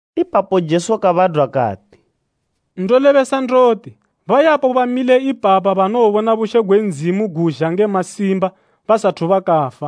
Ipapo Jesu kabadwa kati, “Ndolebesa ndoti, bayapo bamile ipapa banowobona bushe gwe Ndzimu gozha nge masimba, basathu bakafa.”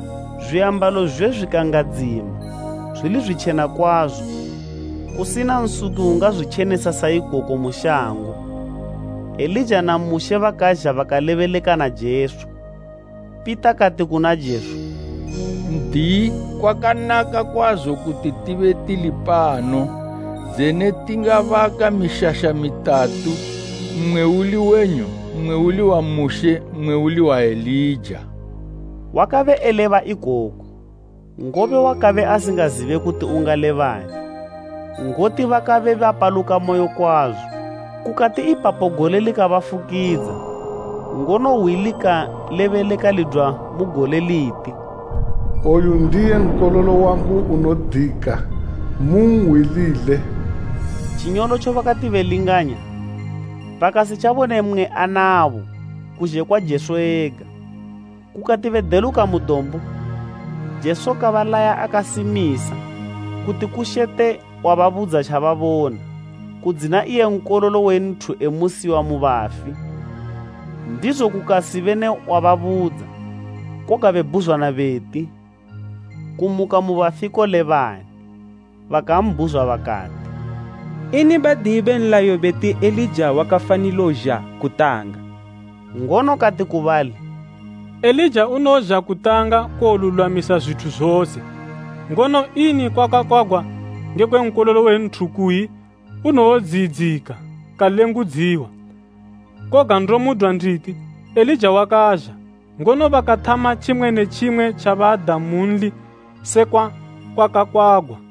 Zwiambalo zwizwe zwikangadzima, zwili zwitjena kwazo, kusina nsuki ungazwitjenesa sa ikoko mu shango. Elija na Mushe bakazha bakalebeleka na Jesu. Pita kati kuna Jesu, “N'diyi, kwaka naka kwazo kuti tibe tilipano. Dzene tingabaka mishasha mitatu, mmwe uli wenyu, mmwe uli wa Mushe, mmwe uli wa Elija.” Wakabe eleba ikoku, ngobe wakabe asingazibe kuti ungalebani, ngoti bakabe bapalukamoyo kwazo. Kukati ipapo gole likabafukidza, ngono hwi likalebeleka lidwa mu gole liti, “Oyu ndiye Nkololo wangu unodika, munhwilile.” Tjinyolotjo bakati belinganya, bakasitjabone mmwe anabo, kuzhe kwa Jesu ega. Kukati bedeluka mu dombo, Jesu kabalaya akasimisa kuti kushete wababudza tjababona, kudzina iye Nkololo we Nthu emusiwa mu bafi. Ndizo kukasibe ne wababudza, koga bebhuzwana beti, “Kumuka mu bafi kolebani.” Bakambhuzwa bakati, “Ini Badiyi be nlayo beti Elija wakafanilo zha kutanga?” Ngono kati ku bali, “Elija unozha kutanga kuwolulwamisa zwithu zose, ngono ini kwakakwagwa ngekwe Nkololo we Nthu kuyi unowodziyidzika kalengudziwa? Koga ndomudwa nditi, Elija wakazha, ngono bakathama tjimwe ne tjimwe tjabada munli sekwa kwakakwagwa.”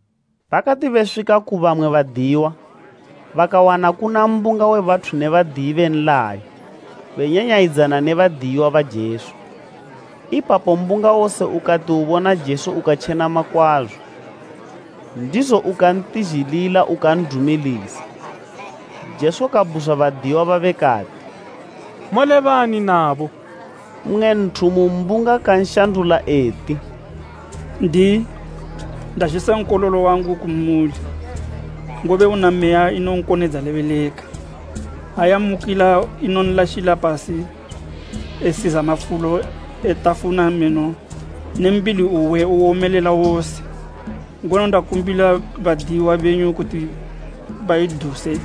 Bakati beswika ku bamwe badiyiwa, bakawana kuna mbunga we bathu ne Badiyi be nlayo benyanyayidzana ne badiyiwa ba Jesu. Ipapo mbunga wose ukati ubona Jesu ukatjenama kwazo, ndizo ukantizhilila ukan'dumilisa. Jesu kabhuzwa badiyiwa babe kati, “Molebani nabo?” Mmwe nthu mu mbunga kanshandula eti, “N'diyi, ndazhisa nkololo wangu kumuli, ngobe una meya inonkonedza lebeleka. Ha yammukila inonlashila pasi esiza mafulo etafuna meno ne mbili uwe uwomelela wose. Ngono ndakumbila badiyiwa benyu kuti baiduse,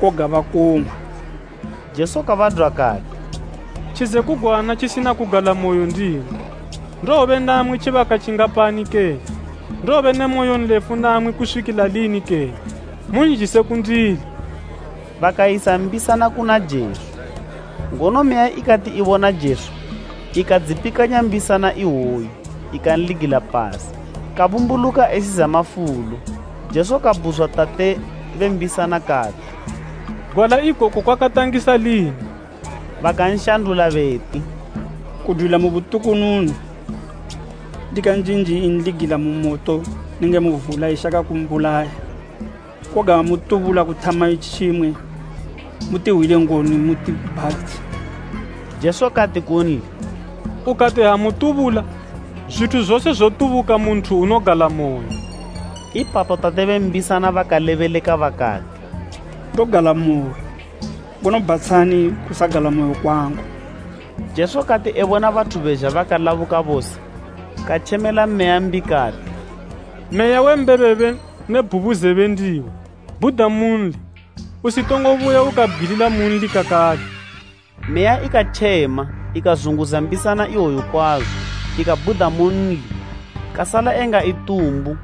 koga bakong'wa.” Jesu kabadwa kati, “Tjizekugwana tjisina kugalamoyo ndimwi, ndowobe namwi tjibaka tjingapani kene? Ndowobe ne moyonlefu namwi kuswikila lini kene? Munzhise kundili.” Bakayisa mbisana kuna Jesu, ngono meya ikati ibona Jesu ikadzipikanya mbisana iwoyo ikanligila pasi, kabumbuluka esiza mafulo. Jesu kabhuzwa tate be mbisana kati, “Gwala ikoku kwakantangisa lini?” Bakanshandula beti, “Kudwila mu butukununu. Ndikanjinji inligila mu moto nenge mu vula ishaka kumbulaya, koga ha mutubula kuthama tjimwe, mutihwile ngoni mutibhatshe.” Jesu kati kunli, “Ukati, ha mutubula? Zwithu zose zotubuka mu nthu unogalamoyo.” Ipapo tate be mbisana bakalebeleka bakati, “Ndogalamoyo, ngono bhatshani kusagalamoyo kwangu.” Jesu kati ebona bathu bezha bakalabuka bose katjemela meya mbi kati, “Meya we mbebebe ne bhubuzebe ndiwe, bhuda munli, usitongo buya ukabgwilila munli kakale.” Meya ikatjema ikazunguza mbisana iwoyo kwazo, ikabhuda munli, kasala enga itumbu,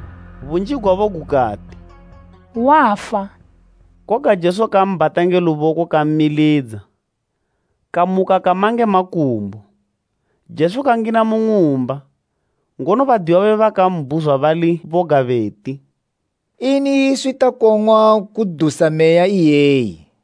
bunji gwabo gukati, “Wafa.” Koga Jesu kambhata nge luboko kammilidza, kamuka kama nge makumbo. Jesu kangina mu ng'umba, ngono badiyiwa babe bakambhuzwa bali boga beti, “Ini iswi takong'wa kudusa meya iyeyi?”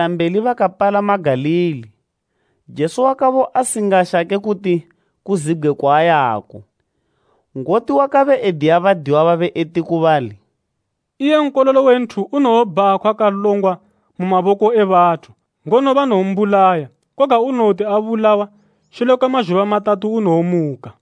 Kudwa ipapo bakayendila mbeli bakapalama Galili. Jesu wakabe asingashake kuti kuzibgwe kwaayako. Ngoti wakabe ediya badiyiwa babe eti ku bali, “Iye Nkololo we Nthu unowobhakhwa kalongwa mu maboko e bathu, ngono banowombulaya, koga unowoti abulawa, shule kwe mazhuba matatu unowomuka.”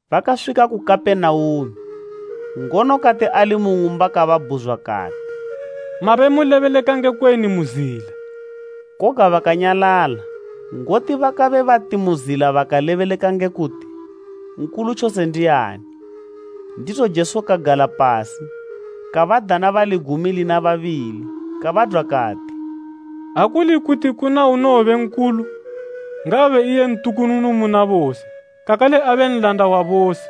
Bakaswika ku Kapenaume, ngono kati ali mu ng'umba kababhuzwa kati, “Mabe mulebeleka ngekweni mu zila?” Koga bakanyalala, ngoti bakabe bati mu zila bakalebeleka ngekwe kuti, nkulu tjose ndiani? Ndizo Jesu kagala pasi, kabadana bali gumi lina babili kabadwa kati, “Ha kuli kuti kuna unowobe nkulu, ngaabe iye ntukununu muna bose, kakale abe nlanda wa bose.”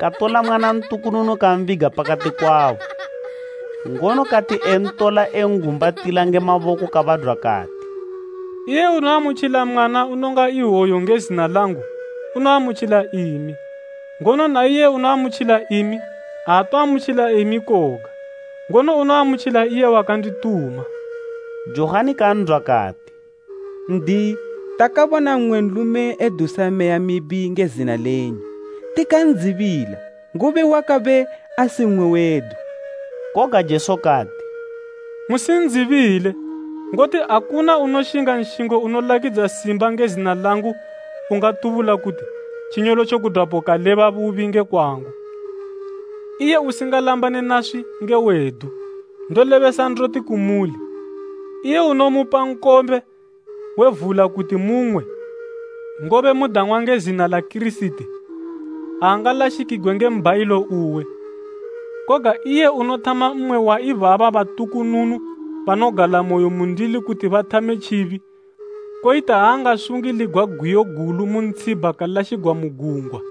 Katola mwana ntukununu kambiga pakati kwabo, ngono kati entola engumbatila nge maboko kabadwa kati, “Iye unoamutjila mwana unonga iwoyu nge zina langu, unoamutjila imi, ngono na iye unoamutjila imi, aatoamutjila imi koga, ngono unoamutjila iye wakandituma.” Johani kan'dwa kati, “N'diyi, takabona mmwe nlume edusa meya mibi nge zina lenyu, tikan'dzibila, ngobe wakabe asi mmwe wedu.” Koga Jesu kati, “Musin'dzibile, ngoti akuna unoshinga nshingo unolakidza simba nge zina langu ungati tjinyolotjo kudwapo kaleba bubi nge kwangu. Iye usingalambane naswi nge wedu. Ndolebesa ndoti kumuli, iye unomupa nkombe we vula kuti mung'we, ngobe mudang'wa nge zina la Kirisiti, aangalashikigwe nge mbhayilo uwe. “Koga iye unothama mmwe wa ibaba batukununu banogalamoyo mundili kuti bathame tjibi, koyita ha angasungiligwa gwiyo gulu mu ntshibha kalashigwa mu gungwa.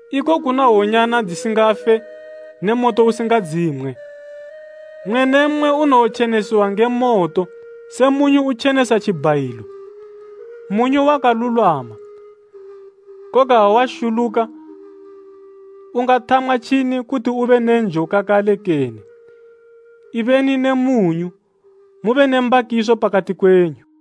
‘Iko kuna hwonyana dzisingafe ne moto usingadzimwe.’ “Mmwe ne mmwe unowotjenesiwa nge moto, se mwenyu utjenesa tjibhayilo. “Mwenyu wakalulwama, koga ha washuluka, ungathamwa tjini kuti ube ne njo kakale kene? “Ibeni ne mwenyu, mube ne mbakiso pakati kwenyu.”